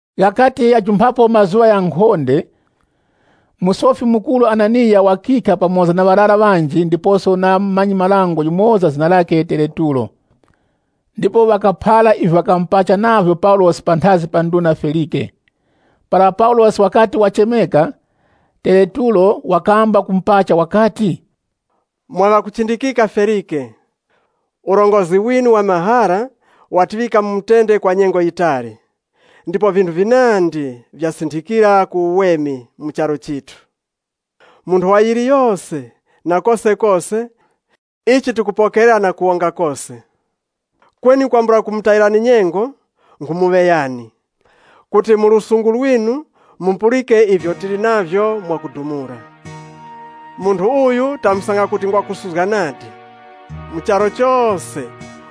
Ghakati ghajumphapo mazuŵa ghankhonde, Musofi Mukuru Hananiya wakikha pamoza na ŵarara ŵanji ndiposo na mumanyi-marango yumoza zina lakhe Tereturo ndipo ŵakaphara ivyo ŵakamupacha navyo Paulosi panthazi pa nduna Felike. Para Paulosi wakati wachemeka, Tereturo wakamba kumupacha wakati, “Mwa ŵakuchindikika, Felike, urongozgi winu wa mahara watiŵika mu mutende kwa nyengo yitali, ndipo vinthu vinandi vyasinthikira ku uweme mu charu chithu. Mu nthowa yiliyose, na kosekose, ichi tikupokerera na kuwonga kose. Kweni kwambula kumutayirani nyengo nkhumuŵeyani kuti mu lusungu lwinu mupulike ivyo tili navyo mwakudumula. Munthu uyu tamusanga kuti ngwa kusuzga nadi. Mu charu chose,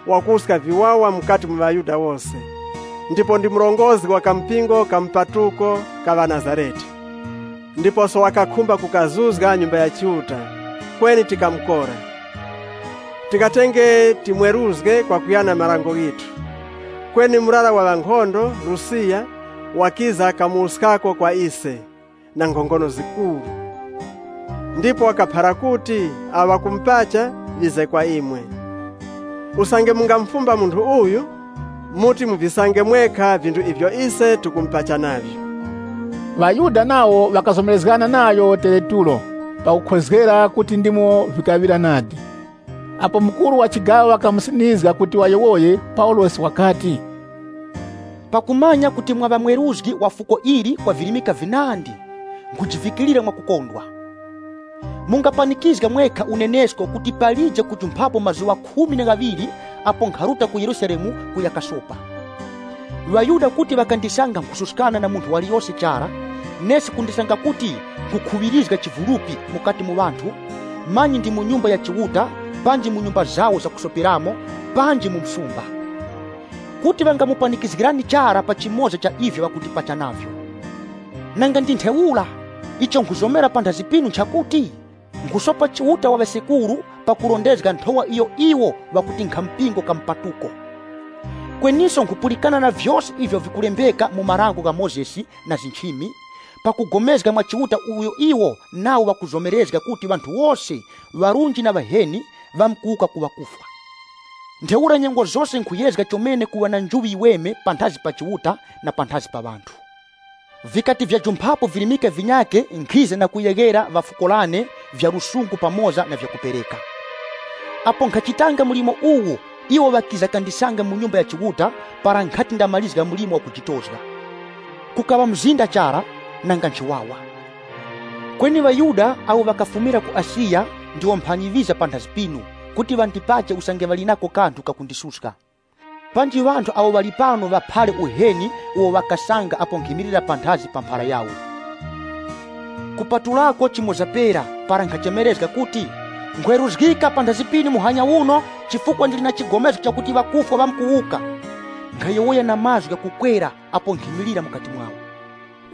wakuwuska viwawa mukati mu ŵaYuda wose, ndipo ndi murongozgi wa kampingo ka mupatuko ka ŵaNazarete. Ndiposo wakakhumba kukazuzga Nyumba ya Chiuta, kweni tikamukora. [Tikatenge timweruzge kwakuyana na marango ghithu, kweni murara wa ŵankhondo Lusiyasi wakiza kamuwuskako kwa ise na nkhongono zikuru. Ndipo wakalangula kuti awo ŵakumupacha ŵize kwa imwe.] Usange mungamufumba munthu uyu, muti muvisange mwekha vinthu ivyo ise tikumupacha navyo.” ŴaYuda nawo ŵakazomerezgana nayo Tereturo pakukhozgera kuti ndimo vikaŵira nadi. Apo mukuru wa chigaŵa wakamusinizga kuti wayowoye, Paulosi wakati, “Pakumanya kuti mwaŵa mweruzgi wa fuko ili kwa virimika vinandi, nkhujivikirira mwakukondwa. Mungapanikizga mwekha unenesko kuti palije kujumphapo mazuŵa apo nkharuta ku Yerusalemu kuya kasopa. 12ŴaYuda kuti ŵakandisanga nkhususkana na munthu waliyose chara, nesi kundisanga kuti nkhukhuŵirizga chivulupi mukati mu ŵanthu, manyi ndi mu Nyumba ya Chiuta panji mu nyumba zawo zakusoperamo, panji mu msumba. Kuti ŵangamupanikizgirani chara pa chimoza cha ivyo ŵakundipacha navyo. Nanga ndi ntheura, icho nkhuzomera panthazi pinu nchakuti, nkhusopa Chiuta wa ŵasekuru pakurondezga Nthowa iyo iwo ŵakuti nkhampingo ka mpatuko. Kweniso nkhupulikana na vyose ivyo vili kulembeka mu Dango la Mozesi na nchimi, pakugomezga mwa Chiuta uyo iwo nawo ŵakumuzomera kuti ŵanthu wose ŵarunji na ŵaheni ŵamkuwuka ku ŵakufwa. Ntheura nyengo zose nkhuyezga chomene kuŵa na njuŵi yiweme panthazi pa Chiuta na panthazi pa ŵanthu. “Vikati vyajumphapo virimika vinyakhe nkhiza na kuyeghera ŵa fuko lane vya lusungu pamoza na vyakupereka. Apo nkhachitanga mlimo uwu, iwo ŵakiza kandisanga mu Nyumba ya Chiuta, para nkhati ndamarizga mlimo wakujitozga. Kukaŵa mzinda chara, nanga nchiwawa. Kweni ŵaYuda ŵakafumira ku Asiya, ndiwo mphanyi ŵiza panthazi pinu, kuti ŵandipache usange ŵali nako kanthu kakundisuska. Panji ŵanthu awo ŵali pano ŵaphare uheni uwo ŵakasanga apo nkhimilira panthazi pa mphara yawo. Kupatulako chimoza pera para nkhachemerezga kuti, ‘Nkhweruzgika panthazi pinu muhanya uno, chifukwa ndili na chigomezgo chakuti ŵakufwa ŵamkuwuka,’ nkhayowoya na mazgu ghakukwera apo nkhimilira mukati mwawo.”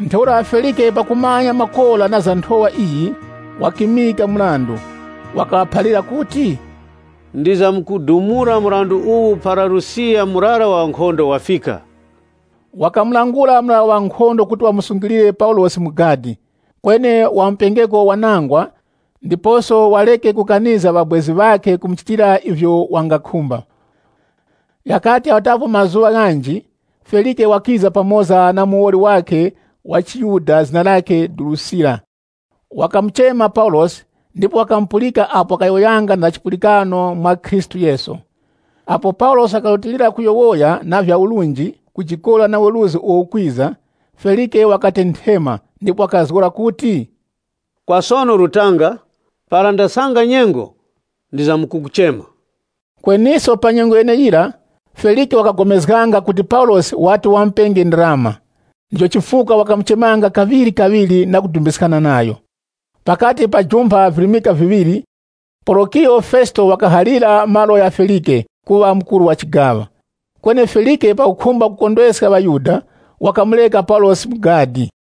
Ntheura Felike pakumanya makora na za Nthowa iyi, wakimika mrandu. Wakaŵaphalira kuti, “Ndizamkudumula mrandu uwu para Lusiyasi murara wa ŵankhondo wafika.” Wakamulangula murara wa ŵankhondo kuti wamusungilire Paulosi mu gadi, kweni wamupengeko wanangwa ndiposo wareke kukanizga ŵabwezi ŵakhe kumuchitira ivyo wangakhumba. Ghakati ghajumphapo mazuŵa ghanji, Felike wakiza pamoza na muwoli wakhe wa chiYuda zina lakhe Durusila. Wakamuchema Paulosi ndipo wakamupulika apo wakayowoyanga na za chipulikano mwa Khristu Yesu. Apo Paulosi wakarutilira kuyowoya na vya urunji, kujikora na weruzgi uwo ukwiza, Felike wakatenthema, ndipo wakazgora kuti, “Kwa sono rutanga, para ndasanga nyengo ndizamkukuchema.” Kweniso pa nyengo yeneyira, Felike wakagomezganga kuti Paulosi wati wamupenge ndarama, ndicho chifukwa wakamuchemanga kaŵirikaŵiri na kudumbiskana nayo. Pakati pajumpha virimika viŵiri, Porokiyo Fesito wakahalira malo gha Felike kuŵa mukuru wa chigaŵa. Kweni Felike pakukhumba kukondweska ŵaYuda wakamureka Paulosi mu gadi.